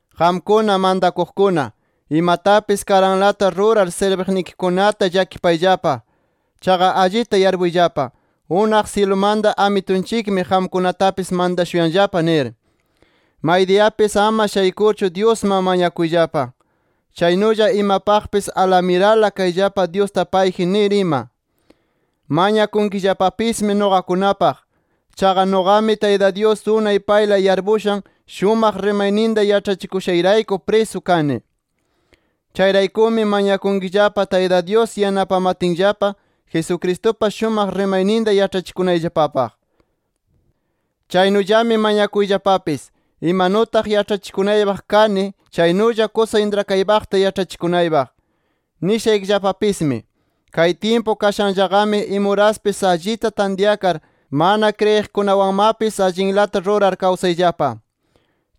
Qamkuna mantakuqkuna, imatapis karanlata rurar sirbiqnikikunata llakipayllapa. Chaqa allita yarpuyllapa, unaq syilumanta Amitunchikmi qamkunatapis mantashuyanllapa nir. Maydiyapis ama shaykurchu Dyusman mañakuyllapa. Chaynulla imapaqpis alamirala kayllapa Dyusta payji nir ima. Mañakunkillapapismi nuqakunapaq. Chaqa nuqami Tayta Dyus unay payla yarpushan, shumaq rimayninta yaĉhachikushayrayku prisu kani. Chayraykumi mañakunkillapa, Tayta Dyus yanapamatinllapa Jesucristupa shumaq rimayninta yaĉhachikunayllapapaq. Chaynullami mañakuyllapapis, imanutaq yaĉhachikunaypaq kani chaynulla, kusa intrakaypaqta yaĉhachikunaypaq. Nishaykillapapismi: Kay tyimpu kashanllaqami imuraspis allita tantyakar mana kriyiqkunawanmapis allinlata rurar kawsayllapa.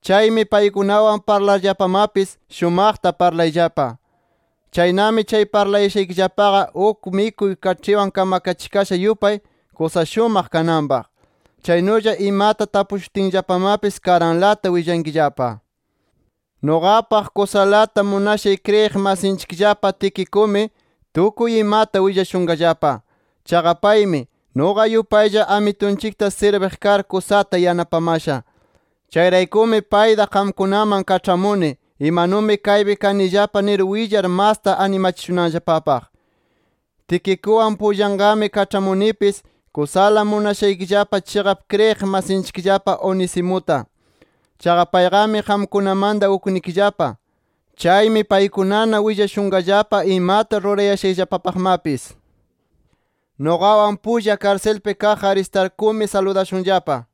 Chaymi paykunawan parlarllapamapis shumaqta parlayllapa. Chaynami chay parlashaykillapaqa, uk mikuy kaĉhiwan kamakachikasha yupay, kusa shumaq kananpaq. Chaynulla imata tapushutinllapamapis karanlata willankillapa. Nuqapaq kusala munashay kriyiq masinchikllapa Tiquicumi, tukuy imata willashunqallapa. Chaqa paymi, nuqa yupaylla Amitunchikta sirbiq kar, kusata yanapamasha. Chayraykumi payta qamkunaman kaĉhamuni imanumi kaypi kanillapa nir willar, masta animachishunanllapapaq. Tiquicuwan pullaqami kaĉhamunipis, kusala munashanchikllapa chiqap kriyiq masinchikllapa Onesimuta. Chaqa payqami qamkunamanta uknikillapa. Chaymi paykunana willashunqallapa imata rurayashayllapapaqmapis. Nuqawan pulla karsilpi kaq Aristarcumi, saludashunllapa.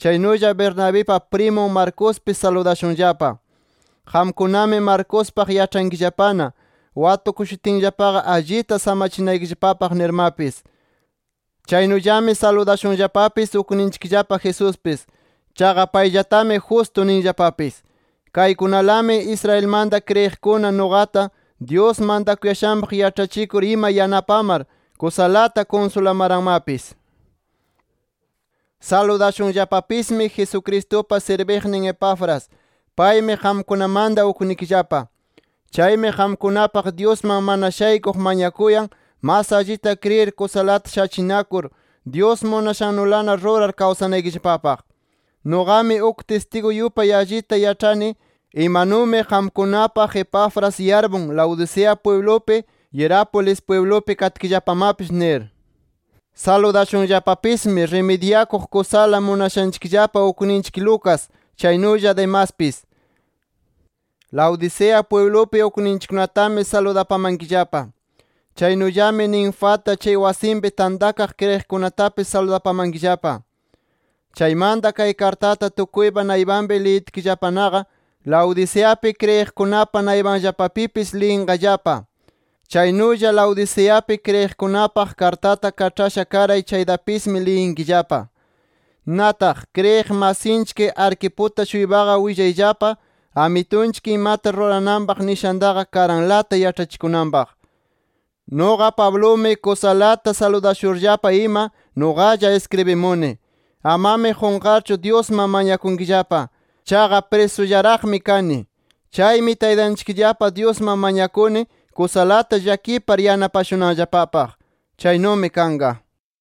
Chaynulla Bernabipa primun Marcospis saludashunllapa. Qamkunami Marcospaq yaĉhankillapana, watukushutinllapaqa allita samachinaykillapapaq nirmapis. Chaynullami saludashunllapapis ukninchikllapa Jesuspis. Chaqa payllatami Justo ninllapapis. Kaykunalami Israelmanta kriyiqkuna nuqata, Dyus mantakuyashanpaq yaĉhachikur ima yanapamar, kusalata kunsulamaranmapis. Saludashunllapapismi Jesucristupa sirbiqnin Epafras. Paymi qamkunamanta uknikillapa. Chaymi qamkunapaq Dyusman mana shaykuq mañakuyan, mas allita kriyir, kusalata shachinakur, Dyus munashannulana rurar kawsanaykillapapaq. Nuqami uk tistigu yupay allita yaĉhani imanumi qamkunapaq Epafras yarpun Laodicea pwiblupi, Hierápolis pwiblupi katkillapamapis nir. Saludashunllapapismi rimidyakuq kusala munashanchikllapa ukninchik Lucas, chaynulla Demaspis. Laodicea pwiblupi ukninchikkunatami saludapamankillapa. Chaynullami Ninfata, chay wasinpi tantakaq kriyiqkunatapis saludapamankillapa. Chaymanta, kay kartata tukuypa naypanpi liyitkillapanaqa, Laodiceapi kriyiqkunapa naypanllapapipis liyinqallapa. Chaynulla Laodiceapi kriyiqkunapaq kartata kaĉhasha karay chaytapismi, liyinkillapa. Nataq, kriyiq masinchik Arquiputa-shuypaqa willayllapa, Amitunchik imata rurananpaq nishantaqa, karanlata yaĉhachikunanpaq. Nuqa Pablumi kusalata saludashurllapa ima, nuqalla iskribimuni. Amami qunqarchu Dyusman mañakunkillapa. Chaqa prisullaraqmi kani. Chaymi Taytanchikllapa Dyusman mañakuni kusalata llakipar yanapashunanllapapaq. Chaynumi kanqa.